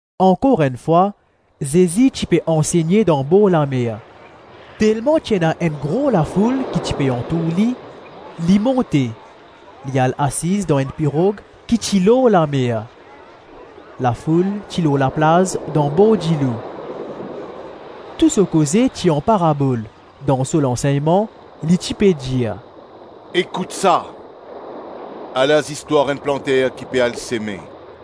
Ankor enn fwa, Zezi ti pe ansegne dan borlamer. Telman ti ena enn gro lafoul ki ti pe antour li, li monte, li al asiz dan enn pirog ki ti lor lamer. Lafoul ti lor laplaz dan bor dilo. Tou so koze ti an parabol; dan so lansegnman li ti pe dir, “Ekout sa. Ala zistwar enn planter ki pe al seme.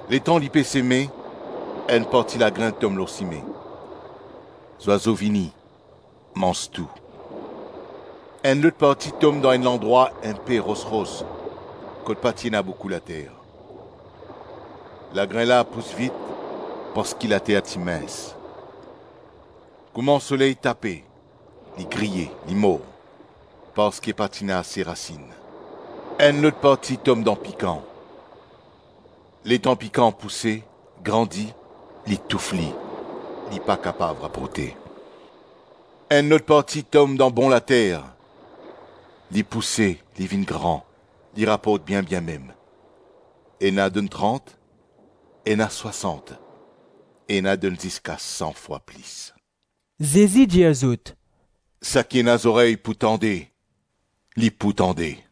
Letan li pe seme, enn parti lagrin tom lor sime. Zwazo vini, manz tou. Enn lot parti tom dan enn landrwa inpe ros-ros kot pa ti ena boukou later. Lagrin la pous vit parski later ti mins. Kouma soley tape, li griye, li mor, parski pa ti ena ase rasinn. Enn lot parti tom dan pikan. Letan pikan pouse, grandi, li touf li; li pa kapav raporte. Enn lot parti tom dan bon later. Li pouse, li vinn gran, li raport bien-bien mem: ena donn trant, ena swasant, ena donn ziska san fwa plis.” Zezi dir zot, “Saki ena zorey pou tande, li pou tande.”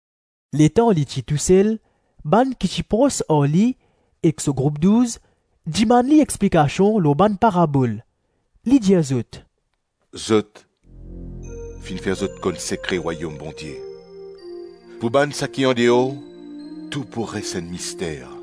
Letan li ti tousel, bann ki ti pros ar li ek so group Douz dimann li explikasion lor bann parabol. Li dir zot, “Zot, finn fer zot konn sekre Rwayom Bondie. Pou bann saki andeor, tou pou res enn mister.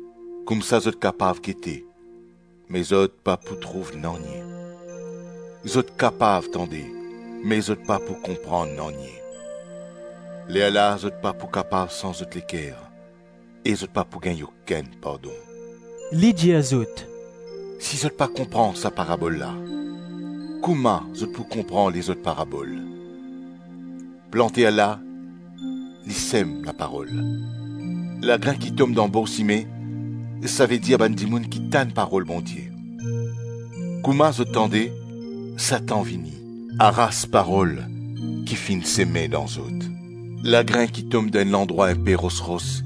Koumsa zot kapav gete, me zot pa pou trouv nanye, Zot kapav tande me zot pa pou konpran nanye, Lerla zot pa pou kapav sanz zot leker e zot pa pou gagn okenn pardon.” Li dir zot, “Si zot pa konpran sa parabol la, kouma zot pou konpran lezot parabol?” “Planter la, li sem laparol. Lagrin ki tom dan bor sime, savedir bann dimoun ki tann parol Bondie. Kouma zot tande, Satan vini, aras parol ki finn seme dan zot. Lagrin ki tom dan enn landrwa inpe ros-ros,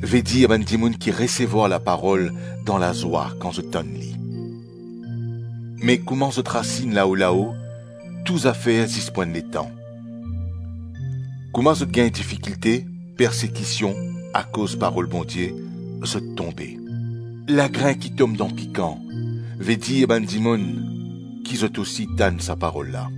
vedir bann dimoun ki resevwar laparol dan lazwa kan zot tann li. Me kouma zot rasinn lao-lao, tou zafer zis pou enn letan; kouma zot gagn difikilte, persekision akoz parol Bondie, zot tonbe. Lagrin ki tom dan pikan, vedir bann dimoun ki zot ousi tann sa parol la.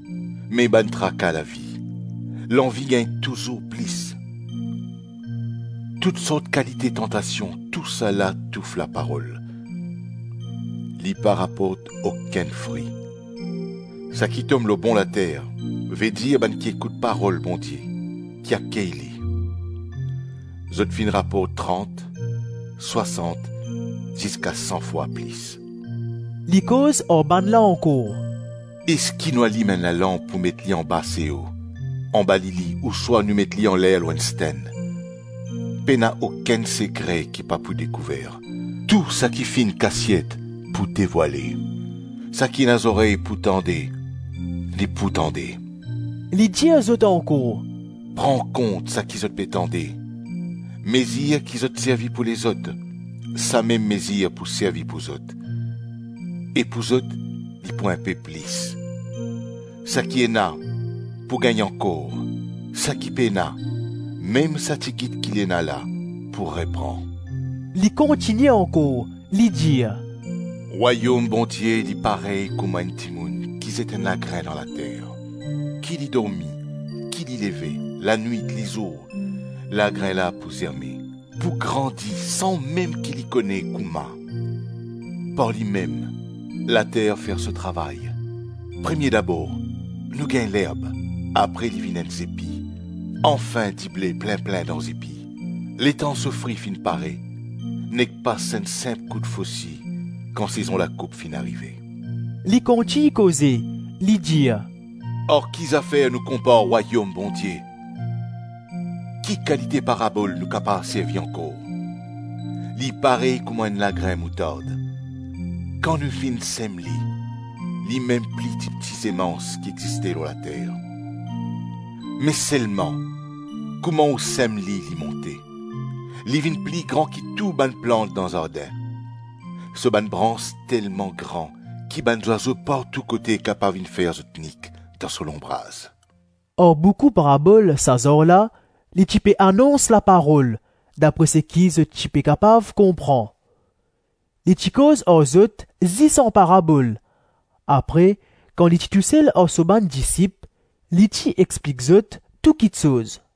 Me bann traka lavi, lanvi gagn touzour plis, tou sort kalite tantasion, tousala touf la parol. Li pa raport okenn fri. Saki tom lor bon later, vedir bann ki ekout parol Bondie, ki akey li. Zot finn raport trant, swasant ziska san fwa plis.” Li koz ar bannla ankor. “Eski nou alim enn lalanp pou met li anba seo, anba lili ouswa nou met li anler lor enn stenn? Pena okenn sekre ki pa pou dekouver; tou saki finn kasiet pou devwale. Saki ena zorey pou tande, li pou tande.” Li dir zot ankor, “Pran kont saki zot pe tande. Mezir ki zot servi pou lezot, samem mezir pou servi pou zot; e pou zot, li pou inpe plis. Saki ena, pou gagn ankor; saki pena, mem sa tigit ki li ena la, pou repran.” Li kontigne ankor, li dir, “Rwayom Bondie li parey kouma enn dimoun ki zet enn lagrin dan later. Ki li dormi, ki li leve, lanwit, lizour, lagrin la pou zerme, pou grandi san mem ki li kone kouma. Par limem, later fer so travay; premie dabor nou gagn lerb, apre li vinn enn zepi, anfin dible plin-plin dan zepi; letan so fri finn pare, nek pas enn sinp kout fosi kan sezon lakoup finn arive.” Li kontign koze, li dir, “Ar ki zafer nou konpar Rwayom Bondie? Ki kalite parabol nou kapav servi ankor? Li parey kouma enn lagrin moutard. Kan nou finn sem li, limem pli tipti semans ki existe lor later. Me selman, kouma ou sem li, li monte. Li vinn pli gran ki tou bann plant dan zardin. So bann brans telman gran ki bann zwazo partou kote kapav vinn fer zot nik dan so lonbraz.” Ar boukou parabol sa zar la, li ti pe anons laparol, dapre seki zot ti pe kapav konpran. Li ti koz ar zot zis an parabol, apre kan li ti tousel ar so bann disip, li ti explik zot tou kiksoz.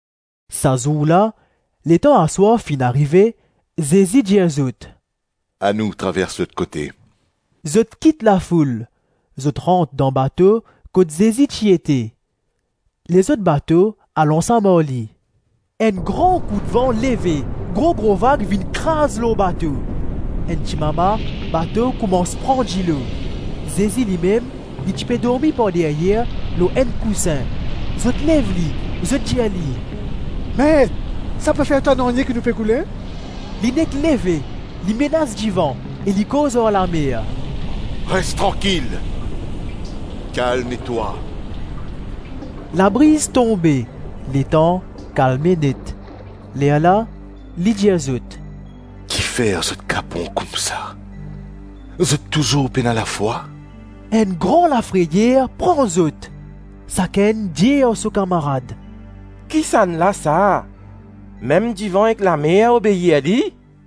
Sa zour la, letan aswar finn arive, Zezi dir zot, “Anou travers lot kote.” Zot kit lafoul, zot rant dan bato kot Zezi ti ete. Lezot bato al ansam ar li. Enn gran koudvan leve; gro-gro vag vinn kraz lor bato. Enn timama, bato koumans pran dilo. Zezi limem, li ti pe dormi par deryer lor enn kousin. Zot lev li, zot dir li, “Met, sa pa fer twa nanye ki nou pe koule?” Li nek leve, li menas divan e li koz ar lamer, “Res trankil, kalme twa.” Labriz tonbe, letan kalme net. Lerla li dir zot, “Kifer zot kapon koumsa? Zot touzour pena lafwa?” Enn gran lafreyer pran zot. Sakenn dir ar so kamarad, “Kisannla sa? Mem divan ek lamer obeir li?”